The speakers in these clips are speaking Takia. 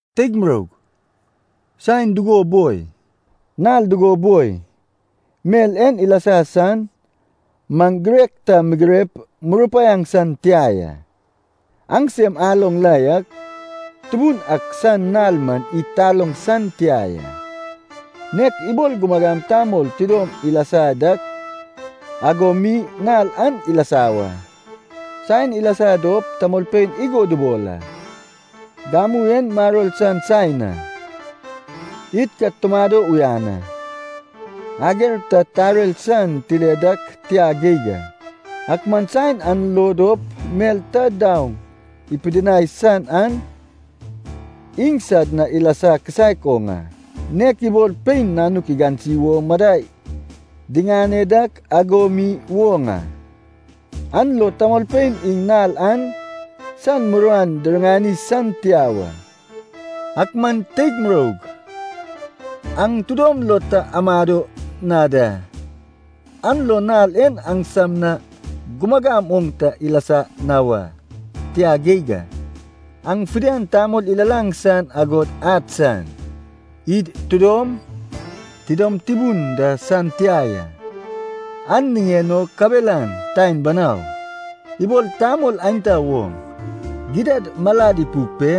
Teig muroug, saen dugo boi, nal dugo boi, mel en ilasa san, maŋ girek ta migirep murupaiaŋ san tia ya. Aŋsem aloŋ la yak, Tubun ak san nal man id taloŋ san tia ya, nek ibol gumagam tamol tidom ilasa dak ago mi nal an ilasa wa. Saen ilasa dop tamolpein igo dubol a, “Gamu en maror san saen a. Id ka tumado uyan a. Ager ta tarer san tile dak tia geig a.” Ak man saen an lo dop mel ta daoŋ ipidinai san an iŋsad na ilasa kisaek oŋ a. Nek ibol pein nanuk digansi wo madai diŋane dak ago mi woŋ a. An lo tamolpein iŋ nal an san muruan diriŋani san tia wa. Ak man teig muroug aŋ tidom lo ta amado na da, an lo nal en aŋsam na gumagam oŋ ta ilasa na wa, tia geig a. Aŋ fidian tamol ilalaŋ san agod ad san, id tidom, tidom tubun da san tia ya. An niŋen o kabelan taen banau, ibol tamol aenta woŋ. Gidad malad ipuk pe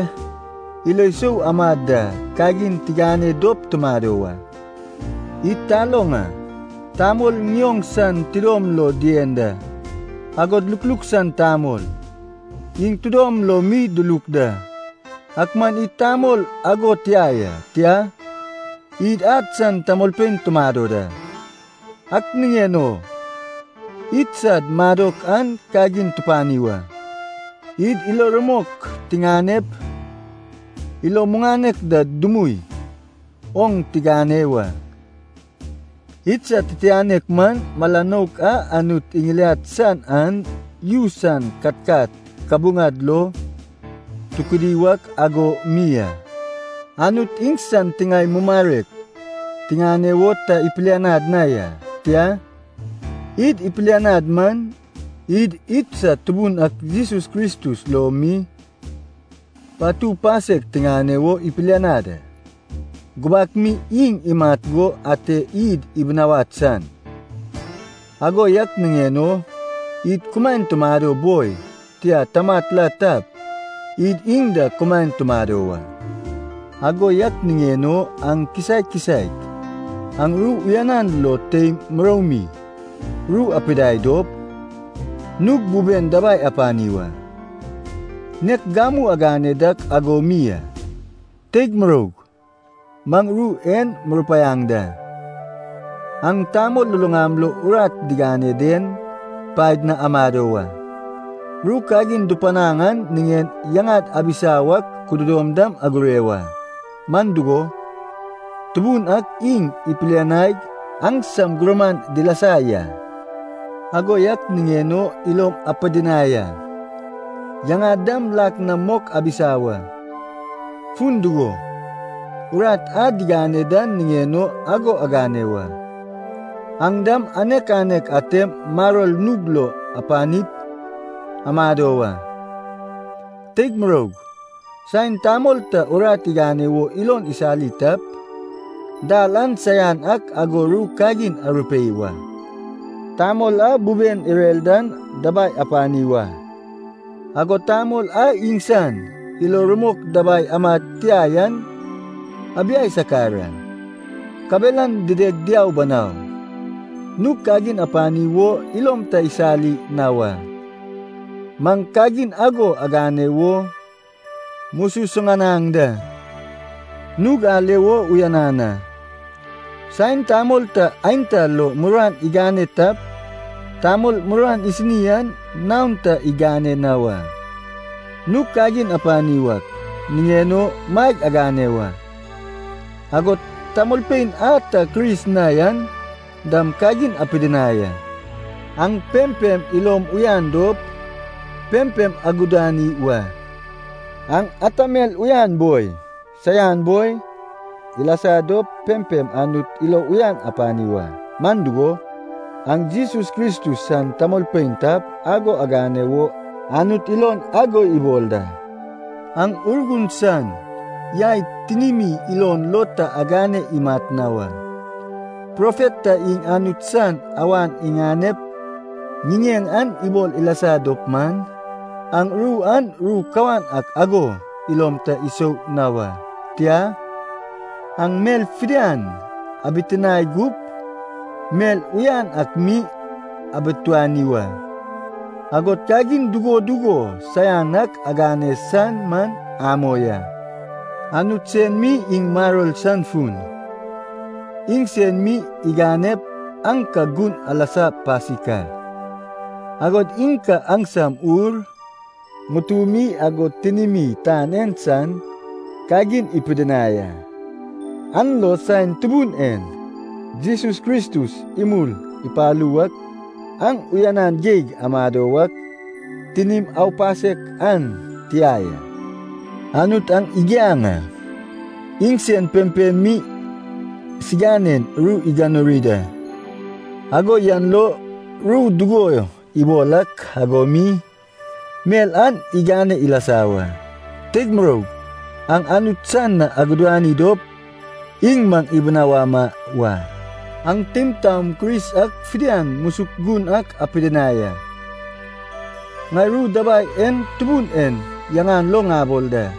ilo isou amad da kagin tigane dop tumado wa. Id taloŋ a, tamol ŋioŋ san tidom lo dien da, agod lukluk san tamol, iŋ tidom lo mi diluk da. Ak man id tamol ago tia ya. Tia, id ad san tamolpein tumado da. Ak niŋen o idsad madok an kagin tupani wa. Id ilo rumok tiŋanep ilo muŋanek da dumui oŋ tigane wa. Idsad titianek man, mala nouk a Anut iŋiliad san an yu san katkat kabuŋad lo tukudi wak ago mi a. Anut iŋsan tiŋae mumarek tiŋane wo ta ipilianad na ya. Tia, id ipilianad man, id idsad Tubun ak Jesus Kristus lo mi patu pasek tiŋane wo ipilianad a. Gubak mi iŋ imat go ate id ibinawad san. Ago yak niŋen o id kumaen tumado boi, tia tamat la tap, id iŋ da kumaen tumado wa. Ago yak niŋen o aŋ kisaek kisaek an ru uyanan lo teim muroumi ru arupidai dop, nug buben dabai apani wa. Nek gamu agane dak ago mi a. Teig muroug, maŋ ru en murupaiaŋ da. Aŋ tamol luluŋam lo urat digane den paed na amado wa. Ru kagin dupanaŋ an niŋen yaŋad abisa wak kududom dam agure wa. Man dugo, Tubun ak iŋ ipilianaig aŋsam gurman dilasa ya. Ago yak niŋen o ilom apidinai a, yaŋad dam lak na mok abisa wa, fun dugo, urat a digane dan niŋen o ago agane wa. Aŋ dam anek anek atem maror nug lo apanip amado wa. Teig muroug, saen tamol ta urat igane wo ilon isali tap, dal an saian ak ago ru kagin arupei wa. Tamol a buben irer dan dabai apani wa, agod tamol a iŋsan ilo rumok dabai amad tia yan abiai sakar a, kabelan dideg diau banau. Nug kagin apani wo ilom ta isali na wa. Maŋ kagin ago agane wo mususuŋanaŋ da. Nug ale wo uyanan a, saen tamol ta aenta lo muruan igane tap tamol muruan isini an naon ta igane na wa. Nug kagin apani wak niŋen o maeg agane wa, agod tamolpein a ta Kris na yan dam kagin apidinai a. Aŋ pempem ilom uyan dop, pempem aguduani wa. Aŋ ata mel uyan boi, saian boi, ilasa dop pempem Anut ilo uyan apani wa. Man dugo, aŋ Jesus Kristus san tamolpein tap ago agane wo Anut ilon ago ibol da. Aŋ Urgun san yai tinimi ilon lo ta agane imat na wa. Profet ta iŋ Anut san awan iŋanep ŋiŋeŋ an ibol ilasa dop man, aŋ ru an ru kawan ak ago ilom ta isou na wa. Tia, aŋ mel fidian abitinae gup, mel uyan ak mi abituani wa. Agod kagin dugo dugo saian ak agane san man amoi a. Anut sen mi iŋ maror san fun. Iŋsen mi iganep aŋ ka gun alasa pasik a. Agod iŋ ka aŋsam ur, ŋutumi agod tinimi tan en san kagin ipidinai a. An lo saen Tubun en Jesus Kristus imul ipalu wak aŋ uyanan geig amado wak tinim aupasek an tia ya. Anut aŋ igiaŋ a, iŋsen pempem mi siganen ru iganuri da, ago yan lo ru dugo ibol ak ago mi, mel an igane ilasa wa. Teig muroug aŋ Anut san na aguduani dop iŋ maŋ ibinawama wa. Aŋ teim taom Kris ak fidian musuk gun ak apidinai a. Ŋai ru dabai en Tubun en yaŋan lo ŋabol da,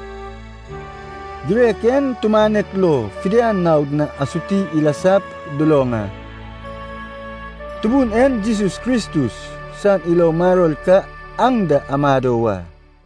girek en tumanek lo fidian naod na asuti ilasap duloŋ a. Tubun en Jesus Kristus san ilo maror ka aŋ da amado wa.